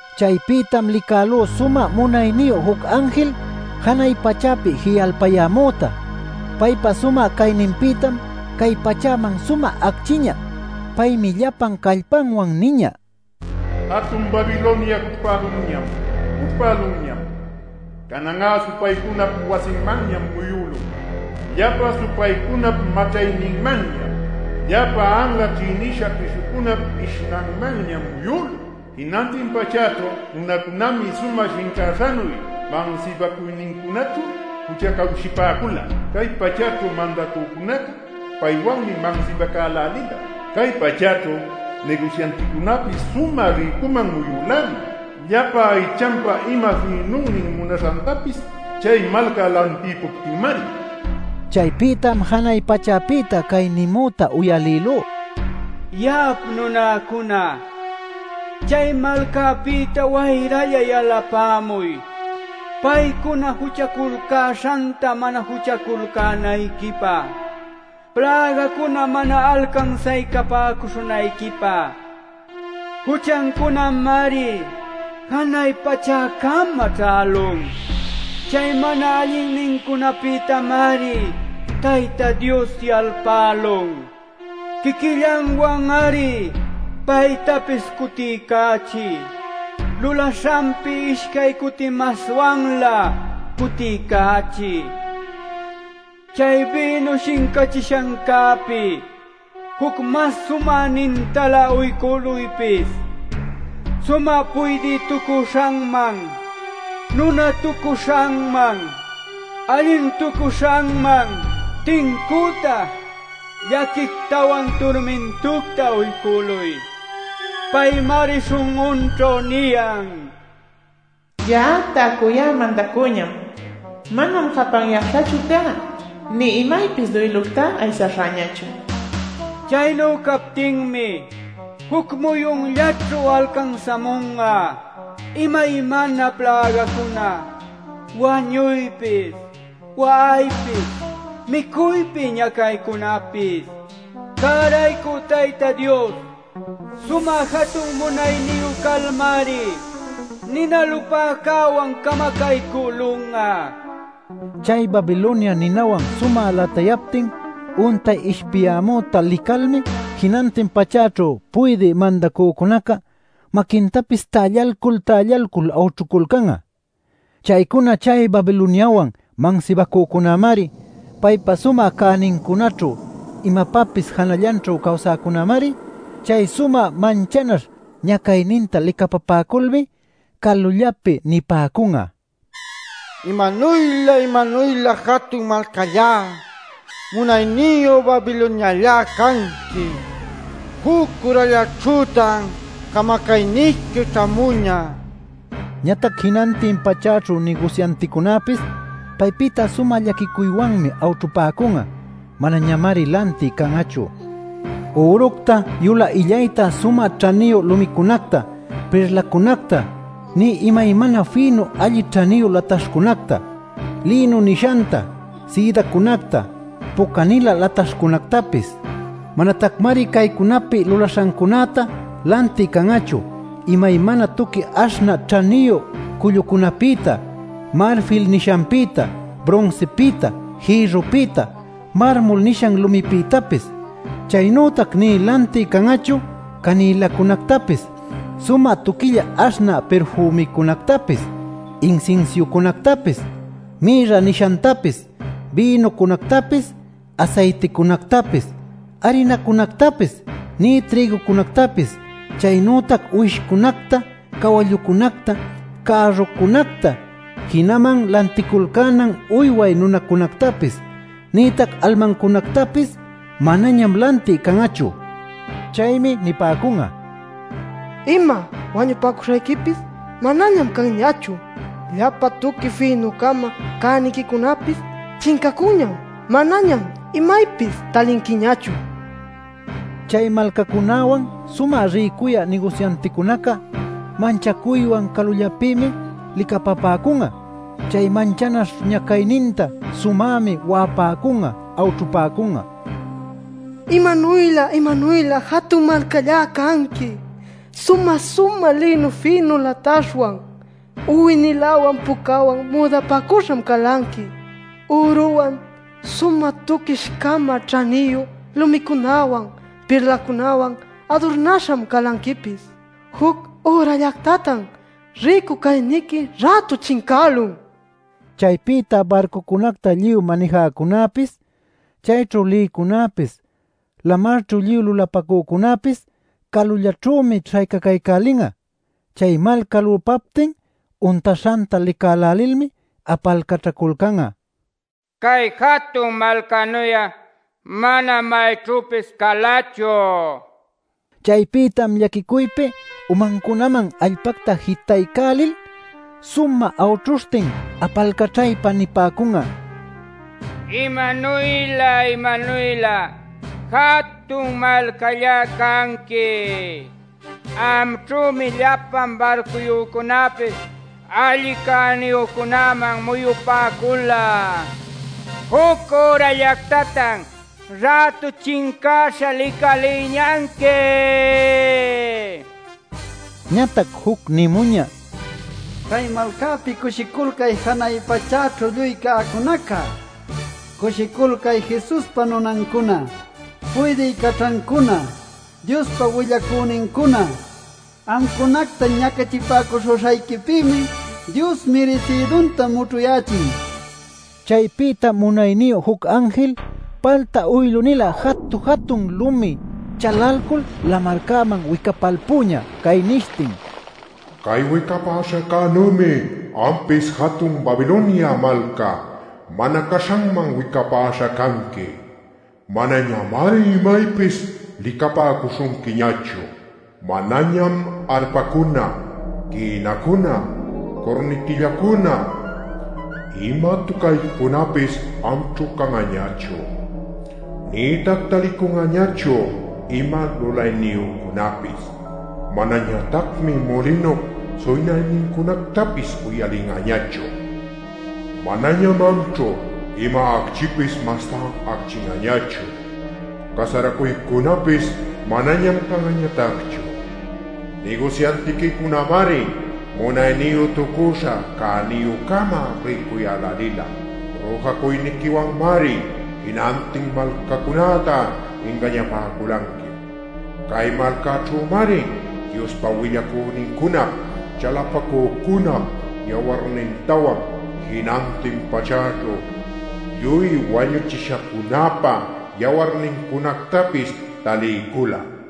Chaypïtam licälú sumä munayniyu juc anjil janay pachäpi ji'alpayämüta. Paypa sumä cayninpïtam cay pachäman sumä acchïñä. Paymi llapan callpanwan niñä: “¡Jatun Babilonia cućhpälunñam, cućhpälunñam! Canan'a supaycunap wasinmanñam muyülun; llapa supaycunap maćhayninmanñam, llapa anla ćhïnisha pishucunap ishnanmanñam muyülun. Jinantin pachäćhu nunacunämi sumä shincäśhanuy mansibacuynincunaćhu juchacawshipäcula. Cay pachäćhu mandacücunaca paywanmi mansibacälälila; Cay pachäćhu nigusyanticunäpis sumä rïcuman muyülälin, llapa aychanpa ima fïnunnin munaśhantapis chay malca lantïpuptinmari” nil. Chaypïtam janay pachäpïta cay nimüta uyalïlú: “Ya'ap nunäcuna, chay malcapïta wayralla yalapämuy paycuna juchaculcäśhanta mana juchaculcänayquipä, plägacuna mana alcansaycapäcuśhunayquipä. Juchancunamari janay pachäcama ćhälun. Chay mana allinnincunapïtamari Tayta Dios yalpälun. Quiquillanwan-ari paytapis cutiycächiy. Lulaśhanpi ishcay cuti maswanlä cutiycächiy. Chay bïnu shincachishancäpi juc mas sumänintalä uycüluypis. Sumä puydïtucuśhanman, nunatucuśhanman, allintucuśhanman tincüta llaquictawan turmintucta uycüluy. Paymari śhun'unćhu niyan: ‘Ya'a täcuyá mandacüñam. Manam japanyäśhachu cá nï imaypis duylucta aysaśhäñachu’ nil. Chaynu captinmi juc muyunllaćhu alcansämun'a imaymana plägacuna: wañuypis, wa'aypis, micuypi ñacaycunapis. Cäraycü Tayta Dios sumä jatun munayniyu calmari nina lupäcäwan camacaycülun'a” nil. Chay Babilonia ninawan sumä latayaptin untay ishpiyämüta licalmi jinantin pachäćhu puydï mandacücunaca maquintapis tällalcul-tällalcul awćhuculcan'a. Chaycuna chay Babiloniawan mansibacücunämari, paypa sumä cänincunaćhu imapapis janallanćhu cawsäcunämari. Chay sumä manchanaśh ñacayninta licapapäculmi calullapi nipäcun'a: “¡Imanuylä, imanuylä jatun malcallá, munayniyu Babiloniallá canqui! ¡Juc ürallaćhütan camacayniqui ćhämuñä!” nil. Ñatac jinantin pachäćhu nigusyanticunäpis paypïta sumä llaquicuywanmi awćhupäcun'a; manañamari lantï can'achu üructa, yulä illayta, sumä ćhaniyu lumicunacta, pirlacunacta, nï imaymana fïnu alli ćhaniyu lataśhcunacta: lïnu nishanta, sïdacunacta, puca-nilä lataśhcunactapis. Manatacmari caycunapi lulaśhacunäta lantï can'achu: imaymana tuqui aśhnä ćhaniyu cullucunapïta, marfil nishanpïta, brunsipïta, jïrrupïta, marmol nishan lumipïtapis. Chaynütac nï lantï can'achu canïlacunactapis, sumä tuquilla aśhnä pirfümicunactapis, insinsiucunactapis, mirra nishantapis, bïnucunactapis, asayticunactapis, arinacunactapis, nï trïgucunactapis. Chaynütac uwishcunacta, cawallucunacta, cärrucunacta, jinaman lanticulcänan uyway nunacunactapis, nïtac almancunactapis manañam lantï can'achu. Chaymi nipäcun'a: “Ima wañupacuśhayquipis manañam canñachu. Llapa tuqui fïnucama cäniquicunapis chincacunñam. Manañam imaypis talinquiñachu” nil. Chay malcacunäwan sumä rïcuyä nigusyanticunaca manchacuywan calullapïmi licapapäcun'a chay manchanaśh ñacayninta. Sumämi wa'apäcun'a awćhupäcun'a: “¡Imanuylä, imanuylä jatun malcallá canqui! Sumä-sumä lïnu fïnu lataśhwan, uwi-niläwan pucawan müdapacüśham calanqui. Üruwan, sumä tuquish-cama ćhaniyu lumicunawan, pirlacunawan adurnäśham calanquipis. Juc ürallactatan rïcu cayniqui rätu chincälun” nil. Chaypïta barcucunacta lluy manijäcunäpis, chayćhu lïcunäpis, lamarćhu lluy lulapacücunäpis calullaćhümi śhaycacaycälin'a. Chay malca lupaptin untaśhanta licälälilmi apalcaćhaculcan'a: “Cay jatun malcanuy'a manam mayćhüpis calachu” nil. Chaypïtam llaquicuypi umancunaman allpacta jitaycälil sumä awćhuśhtin apalcaćhaypa nipäcun'a: “¡Imanuylä imanuylä jatun malcallá canqui! Amćhümi llapa barcuyücunapis alli cäniyücunaman muyupäcula. ¡Juc ürallactatan rätu chincäśha licalïñanqui!” nil. Ñatac juc nimuñä: “¡Cay malcapïta cushiculcay janay pachäćhu lluy cäcunacá! ¡Cushiculcay Jesuspa nunancuna, puydï caćhancuna, Diospa willacünincuna! Amcunacta ñacachipäcuśhuśhayquipïmi Dios mirisïdunta mućhuyächin” nil. Chaypïtam munayniyu juc anjil palta uylu-nilä jatu-jatun lumi chalalcul lamarcäman wicapalpüñä, cay nishtin: “Cay wicapaśhäcänümi ampis jatun Babilonia malca mana caśhanman wicapäśha canqui. Manañamari imaypis licapäcuśhunquiñachu. Manañam arpacuna, quïnacuna, curnitillacuna, ima tucaycunapis amćhu can'añachu. Nïtac talicun'añachu ima lulayniyücunapis. Manañatacmi mulinup suynaynincunactapis uyalin'añachu. Manañam amćhu ima acchipis mastá acchin'añachu. Casaracuycunapis manañam can'añatacchu. Nigusyantiquicunämari munayniyütucuśha cäniyü-cama rïcuyälälila. Rüjacuyniquiwanmari jinantin malcacunacta ingañapäculanqui. Cay malcaćhümari Diospa willacünincunap, chalapacücunap yawarnintawan jinantin pachäćhu lluy wañuchishacunäpa yawarnincunactapis taliycula” nil.